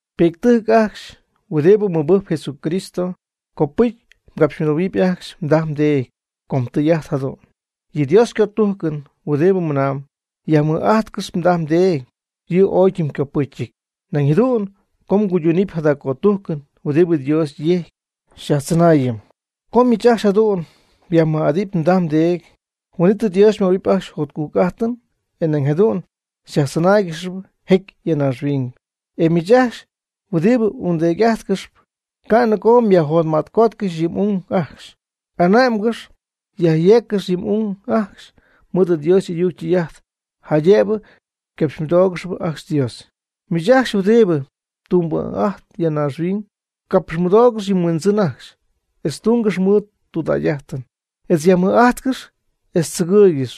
Pi'ctɨjc ajcxy huɨdibɨ mɨbɨjcp Jesucristo, copɨcy mgapxymɨdoohuɨpy ajcxy mdaj mdeedy, com tɨy'ajt jadu'n. Yɨ Dios ycötujcɨn huɨdibɨ mɨnaamb: “Yajmɨj'ajtcɨx mdaj mdeedy”, yɨ' ooy ytɨmycopɨcyɨty. Nañ jadu'n co nguyduunɨm jada cötujcɨn, huin'it Dios jecy xyajtzɨnaayɨm. Co miich ajcxy jadu'n myajmɨj'adɨpy mdaj mdeedy, huin'it Dios xymöhuɨpy ajcxy jotcujc'ajtɨn, e nañ jadu'n xyajtzɨnáaygɨxɨpy jecy ya naaxhuiñ. E miich ajcxy huɨdibɨ ungdeedy'ajtcɨxp, ca' nɨgoo myajjotma'tcotcɨxy yɨ m'ung ajcxy. Ane'mgɨx yajyeeccɨx yɨ m'ung ajcxy mɨɨd Dios y'ayuc ytɨy'ajt, jaydëbɨ capxymɨdóogɨxɨpy ajcxy Dios. Miich ajcxy huɨdibɨ tumbɨ'ajtp ya naaxhuiñ, capxymɨdoogɨx yɨ mhuindzɨn ajcxy, etz tungɨx mɨɨd tudägy'ajtɨn, etz yajmɨj'ajtcɨx etz tzɨgɨɨygɨx.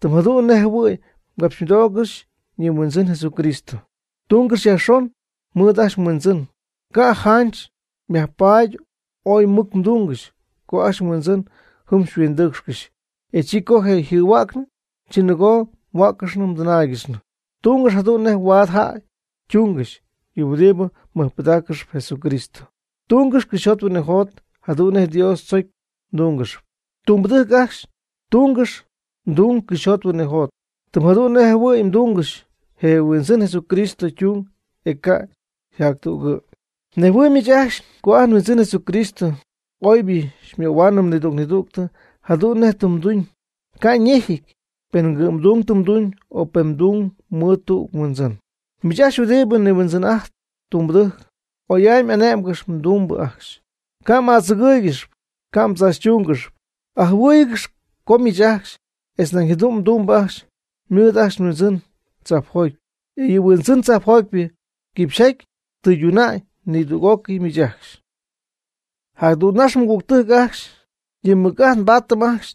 Tɨm jadu'n nej jɨhuɨ̈y mgapxymɨdoogɨxy yɨ mHuindzɨn Jesucristo. Tungɨx yajxon mɨɨd ajcxy mhuindzɨn. Ca' janch xypaat oy mɨc mduungɨxy co ajcxy mhuindzɨn jɨm xyhuindɨɨcxcɨxy, e chi co je' yjɨhuäcnɨ, chi nɨgoo mhuäccɨxnɨ mdɨnáaygɨxnɨ. Tungɨx jadu'n nej huaad jäy ytuungɨxy yɨ huɨdibɨ mɨjpɨdaaccɨxp Jesucristo. Tungɨx cɨxyjot huinɨjot jadu'n nej Dios tzocy mdúngɨxɨpy. Tumbɨdɨjc ajcxy, tungɨx mdung cɨxyjot huinɨjot, tɨm jadu'n nej jɨhuɨ̈y mdungɨxy je Huindzɨn Jesucristo ytung, e ca' yjäydungɨty. Mnejhuɨɨyb miich ajcxy co ajt nHuindzɨn Jesucristo oybɨ möhua'ñ nidüg nidüg jadu'n nej tɨ ytuuñ, ca' ñejɨty pen ycɨ'mdung ytumyb, o pen ytumb mɨɨd tüg huindzɨn. Miich ajcxy huɨdibɨ nihuindzɨn'ajtp tumbɨdɨjc, oy'amy ane'mgɨx mdumbɨ ajcxy. Ca'm'adzɨgɨ́ɨygɨxɨpy ca' mdzaachytúngɨxɨpy. Ajɨhuɨ́ɨyɨgɨxy co miich ajcxy etz nañ jadu'n mdumbɨ ajcxy mɨɨd ajcxy mHuindzɨn tzajpjoty, e yɨ mHuindzɨn tzajpjotypɨ quipxyjaty tɨyduna'ñ nidüg'ócɨy miich ajcxy. Jadügnax, mɨgügtɨjc ajcxy, yɨ mmɨc'ajt mbaadɨp ajcxy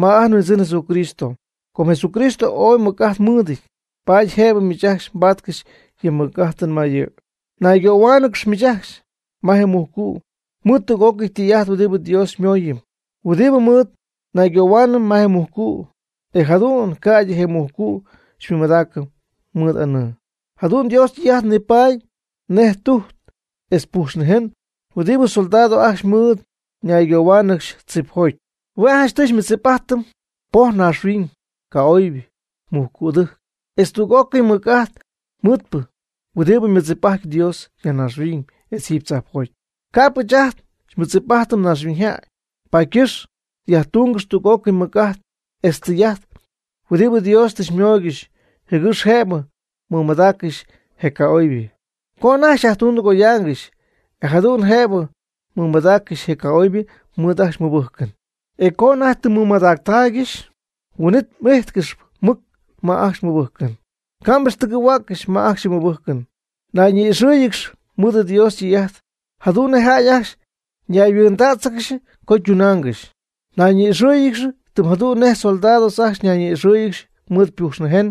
ma ajt nHuindzɨn Jesucristo. Com Jesucristo ooy mɨc'ajt mɨɨdɨty, paady jëbɨ miich ajcxy mbatcɨxy yɨ mmɨc'ajtɨn ma yɨ'. Naygohuaanɨgɨxy miich ajcxy ma je mujcu' mɨɨd tüg'ócɨy tɨy'ajt huɨdibɨ Dios xymooyɨm, huɨdi mɨɨd naygohuaanɨm ma je mujcu', e jadu'n ca'ydɨ je mujcu' xymɨmadaacɨm mɨɨd anɨɨ. Jadu'n Dios ytɨy'ajt nipaady nej tujt etz pujxnïjen huɨdibɨ soldados ajcxy mɨɨd naygohuaangɨxy tzipjoty. Hue' janchtɨy xymɨdzip'ajtɨm poj naaxhuiñ, ca'oybɨ, mujcu'dɨjc, etz tüg'ócɨy mɨc'ajt mɨɨdpɨ huɨdibɨ mɨdzip'ajtp Dios ya naaxhuiñ etz jiiby tzajpjoty, ca'p ɨɨch ajt nmɨdzip'ajtɨm naaxhuiñyjäy. Paady ycɨxp yajtúngɨxy tüg'ócɨy mɨc'ajt etz tɨy'ajt huɨdibɨ Dios tɨ xymooygɨxy, jɨgɨx jëbɨ mmɨmadaaccɨxy je ca'oybɨ co anajty xyajtundɨgoyaangɨxy. E jadu'n jëbɨ mɨmadaaccɨxy je ca'oybɨ mɨɨd ajcxy mmɨbɨjcɨn. E co anajty tɨ mmɨmadactaaygɨxy, huin'it m'íjtcɨxɨpy mɨc ma ajcxy mmɨbɨjcɨn. Ca' m'ixtɨgɨ̈huäccɨx ma ajcxy yɨ mmɨbɨjcɨn. Nayñi'ixɨ́ɨyɨgɨx mɨɨd Dios ytɨy'ajt, jadu'n nej jäy ajcxy ñayhuɨɨndädzɨgɨxy co ytunaangɨxy. Nayñi'ixɨ́ɨyɨgɨx tɨm jadu'n nej soldados ajcxy ñayñi'ixɨɨygɨxy mɨɨd pujx nïjen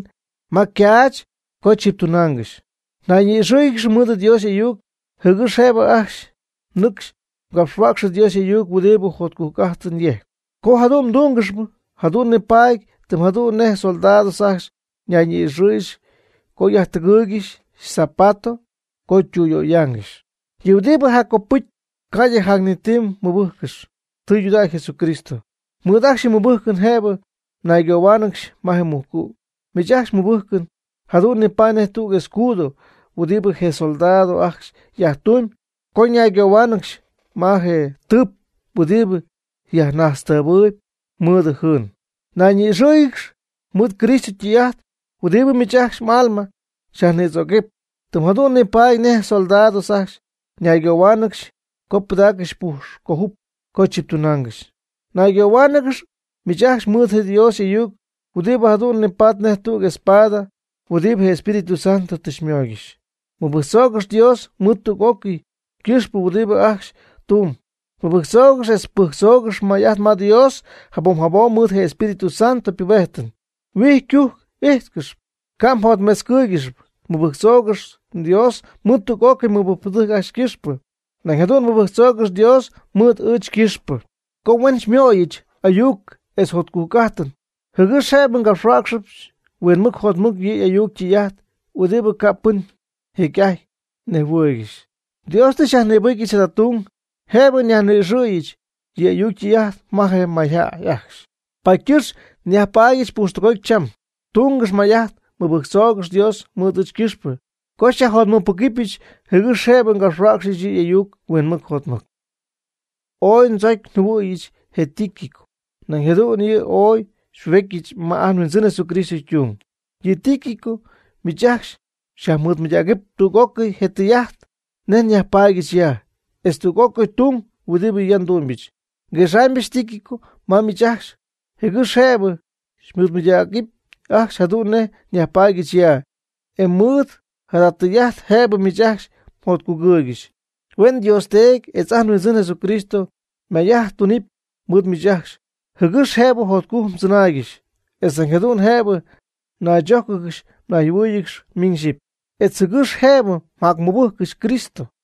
ma caach co chɨptunaangɨxy. Nayñi'ixɨ́ɨyɨgɨx mɨɨd Dios y'ayuc, jɨgɨx jëbɨ ajcxy nɨcxy mgapxhuäcxɨ Dios y'ayuc huɨdibɨ jotcujc'ajtɨn yejcp. Co jadu'n mdúngɨxɨpy, jadu'n nibaadɨp tɨm jadu'n nej soldados ajcxy ñayñi'ixɨ́ɨyɨgɨxy co yajtɨgɨɨygɨxy yzapato co ytüyöyaangɨxy. Yɨ' huɨdibɨ jac copɨcyɨp ca'ydɨ jac ni ti, mɨbɨjccɨx tɨydudägy Jesucristo. Mɨɨd ajcxy yɨ mmɨbɨjcɨn jëbɨ mnaygohuáanɨgɨxy ma je mujcu'. Miich ajcxy mmɨbɨjcɨn jadu'n nipaady nej tüg escudo huɨdibɨ je soldados ajcxy yajtumyb co ñaygohuáanɨgɨx ma je tɨp huɨdibɨ yajnajtztɨɨbɨɨyb mɨɨdɨ jɨɨn. Nayñi'ixɨ́ɨyɨgɨx mɨɨd Cristo ytɨy'ajt huɨdibɨ mɨɨd ajcxy m'alma xyajnïdzoocɨp, tɨm jadu'n nipaady nej soldados ajcxy ñaygohuáanɨgɨxy co pɨdaaccɨxy ypujx cöjup co chiptunaangɨxy. Naygohuáanɨgɨx miich ajcxy mɨɨd Dios y'ayuc huɨdibɨ jadu'n nipatp nej tüg espada huɨdibɨ je Espíritu Santo tɨ xymooygɨxy. Mɨbɨjctzoogɨx Dios mɨɨd tüg'ócɨy ycɨxpɨ huɨdibɨ ajcxy mdumyb. Mɨbɨjctzoogɨx etz pɨjctzoogɨx may'ajt ma Dios jabom jabom mɨɨd je Espíritu Santo ypubejtɨn. Huijy ycujc m'ijtcɨxɨpy, ca' mjotmetzcɨ́ɨygɨxɨpy. Mɨbɨjctzoogɨx Dios mɨɨd tüg'ócɨy mɨbɨjcpɨdɨjc ajcxy ycɨxpɨ. Nañ jadu'n mɨbɨjctzoogɨx Dios mɨɨd ɨɨch ycɨxpɨ, co huen xymöyɨch ayuc etz jotcujc'ajtɨn, jɨgɨx jëbɨ ngapxhuäcxɨbɨch huinmɨc jotmɨc yɨ' y'ayuc ytɨy'ajt huɨdibɨ ca' pɨn jecy'ajty nejhuɨɨygɨxy. Dios tɨ xyajnïbɨcyɨch jada tung jëbɨ nyajnɨcxyɨch yɨ' y'ayuc ytɨy'ajt ma je mayjäy ajcxy. Paady ycɨxp nyajpaadyɨch pujxtɨgoty cham. Tungɨx may'ajt mɨbɨjctzoogɨx Dios mɨɨd ɨɨch ycɨxpɨ co xyajjotmɨcpɨgɨpyɨch jɨgɨx jëbɨ ngapxhuäcxyɨch yɨ' y'ayuc huinmɨc jotmɨc. Ooy ndzocy njɨhuɨ̈yɨch je Tíquico, nañ jadu'n yɨ' ooy xypubejtyɨch ma ajt nHuindzɨn Jesucristo ytung. Yɨ Tíquico miich ajcxy xyajmɨɨdmɨydägɨpy tüg'ócɨy je tɨy'ajt nej nyajpaadyɨch ya, etz tüg'ócɨy tung huɨdibɨ ya ndumybɨch. Nguexaamybɨch Tíquico ma miich ajcxy jɨgɨx jëbɨ xymɨɨdmɨydägɨpy ajcxy jadu'n nej nyajpaadyɨch ya, e mɨɨd jada tɨy'ajt jëbɨ miich ajcxy mjotcugɨɨygɨxy. Huen Dios Teedy etz ajt nHuindzɨn Jesucristo may'ajt tunɨpy mɨɨd miich ajcxy, jɨgɨx jëbɨ jotcujc mdzɨnaaygɨxy, etz nañ jadu'n jëbɨ mnaychójcɨgɨxy mnayjɨhuɨ́ɨyɨgɨxy miñ xyɨpy, etz jɨgɨx jëbɨ mjacmɨbɨjccɨxy Cristo.